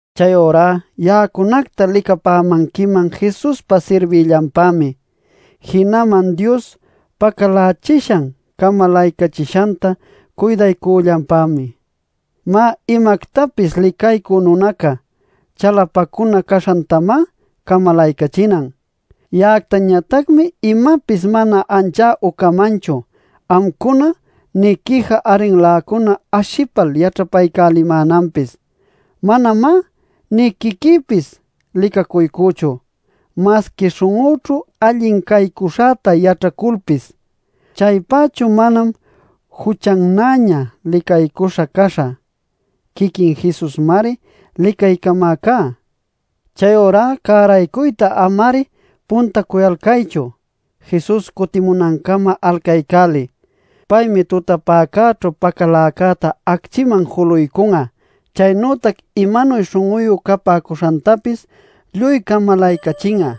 Chayurá ya'acunacta licapämanquiman Jesuspa sirbïllanpämi, jinaman Dios pacalächishan camalaycachishanta cuydaycüllanpämi. Má, imactapis licaycü nunaca chalapacunä caśhantamá camalaycachinan. Ya'actañatacmi imapis mana ancha ucamanchu amcuna nï quija arrinläcuna ashipal yaćhapaycälimänanpis. ¡Manamá nï quiquïpis licacuycüchu! Masqui śhun'üćhu allin caycuśhäta yaćhaculpis, chaypächu manam juchannäña licaycuśha caśhä. Quiquin Jesusmari licaycamäcá. Chayurá cäraycuyta ama-ari puntacuyalcaychu; Jesus cutimunancama alcaycäliy. Paymi tutapäcäćhu pacaläcäta acchïman juluycun'a, chaynütac imanuy śhun'uyu capäcuśhantapis lluy camalaycachin'a.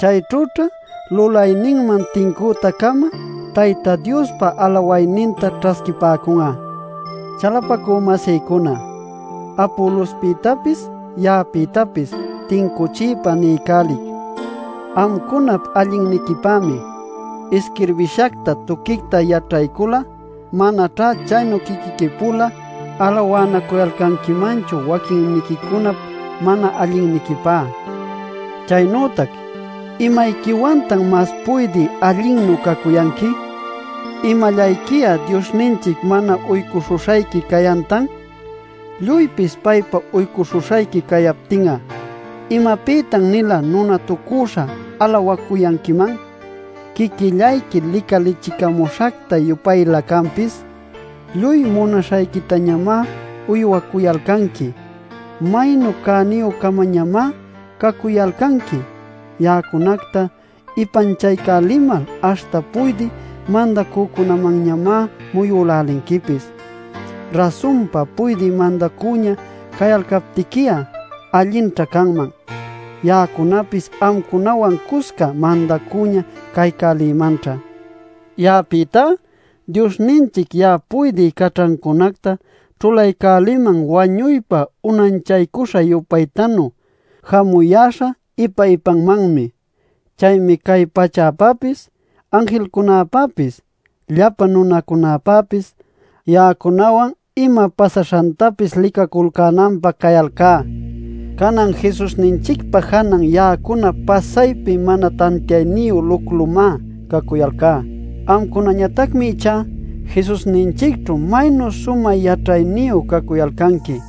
Chayćhüćha lulayninman tincüta-cama Tayta Diospa alawayninta ćhasquipäcun'a. Chalapacü-masïcuna, Apolospïtapis, ya'apïtapis tincuchiypa niycälic amcunap allinniquipämi. Isquirbishacta tuquicta yaćhaycul'a manaćhá chaynu quiquiqui-pula alawanacuyalcanquimanchu waquinniquicunap mana allinniquipä. Chaynütac ¿imayquiwantan mas puydï allinnu cacuyanqui? ¿Imallayqui'a Diosninchic mana uycuśhuśhayqui cayantan? Lluypis paypa uycuśhuśhayqui cayaptin'a ¿imapïtan-nila nunatucüśha alawacuyanquiman, quiquillayqui licalichicamuśhacta-yupaylä canpis? ¡Lluy munaśhayquitañamá uywacuyalcanqui! ¡Maynu cäniyü-camañamá cacuyalcanqui! ¡Ya'acunacta ipanchaycälimal aśhta puydï mandacücunamanñamá muyülälinquipis! Rasunpa puydï mandacüña cayalcaptiqui'a allinćha canman; ya'acunapis amcunawan cusca mandacüña caycälïmanćha. Ya'apïtá, Diosninchic ya'a puydï caćhancunacta ćhulaycäliman wañuypa unanchaycuśha-yupaytanu jamuyäśha ipa-ipamanmi. Chaymi cay pachäpäpis, anjilcunapäpis, llapa nunacunapäpis, ya'acunawan ima pasaśhantapis licaculcänanpä cayalcá. Canan Jesusninchicpa janan ya'acuna pasaypi mana tantiayniyu luclumá cacuyalcá. Amcunañatacmi ichá Jesusninchicćhu ¡maynu sumä yaćhayniyu cacuyalcanqui!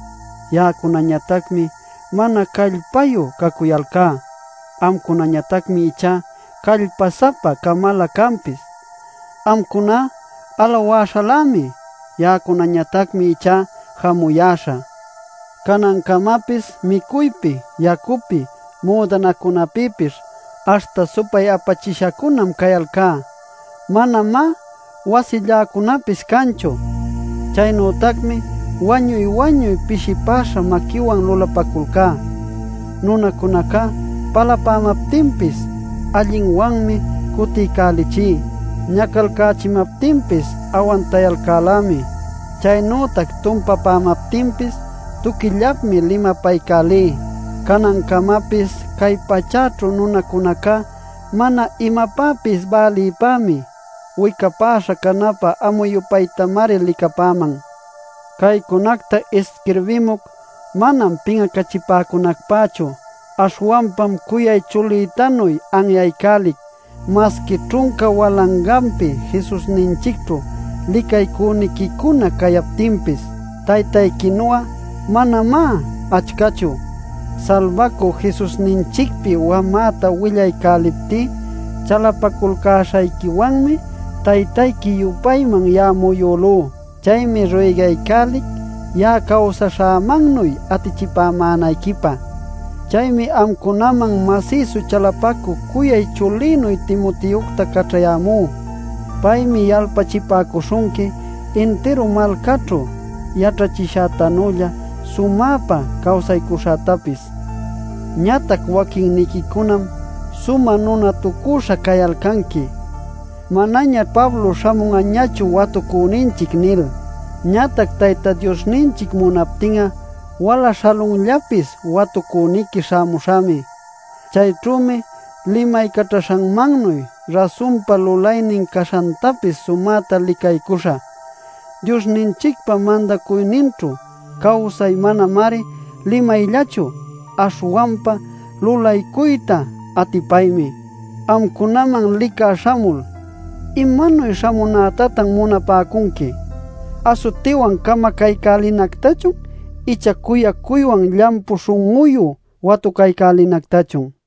Ya'acunañatacmi mana callpayu cacuyalcá; amcunañatacmi ichá callpa-sapa-camalä canpis. Amcuná alawäśhalämi; ya'acunactañatacmi ichá jamuyäśha. Canancamapis micuypi, yacupi, müdanacunapïpis, aśhta supay-apachishacunam cayalcá. Manamá wasilläcunapis canchu. Chaynütacmi wañuy-wañuy pishipäśha maquïwan lulapäculcá. Nunacunaca palapämaptinpis allinwanmi cutiycälichí. Ñacalcächimaptinpis awantayalcälämi. Chaynütac tumpapämaptinpis tuquillapmi limapaycälí. Canancamapis cay pachäćhu nunacunaca mana imapäpis bälïpämi, wicapäśha canapä amu-yupaytamari licapäman. Caycunacta isquirbimuc manam pin'acachipäcunacpächu, aśhwanpam cuyay chulïtanuy anyaycälic. Masqui ćhunca walanganpi Jesusninchicćhu licaycüniquicuna cayaptinpis, taytayquinu'a manamá achcachu. Salbacü Jesusninchicpi wamäta willaycäliptí chalapaculcäśhayquiwanmi taytayqui-yupayman ya'a muyülú. Chaymi ruygaycälic ya'a cawsaśhämannuy atichipämänayquipä. Chaymi amcunaman masïsu chalapacü cuyay chulïnuy Timoteocta caćhayämú. Paymi yalpachipäcuśhunqui intiru malcaćhu yaćhachishätanülla sumäpa cawsaycuśhätapis. Ñatac waquinniquicunam sumä nunatucüśha cayalcanqui “Manañaćh Pablo śhamun'achu watucüninchic” nil. Ñatac Tayta Diosninchic munaptin'a wala śhalunllapis watucüniqui śhamuśhämi. Chayćhümi limaycaćhaśhanmannuy rasunpa lulaynin caśhantapis sumäta licaycuśhä. Diosninchicpa mandacuyninćhu cawsay manamari limayllachu, aśhwanpa lulaycuyta atipaymi. Amcunaman licä śhamul ¿imanuy śhamunätatan munapäcunqui? ¿Asutiwan camacaycälinactachun icha cuyacuywan llampu śhun'uyu watucaycälinactachun?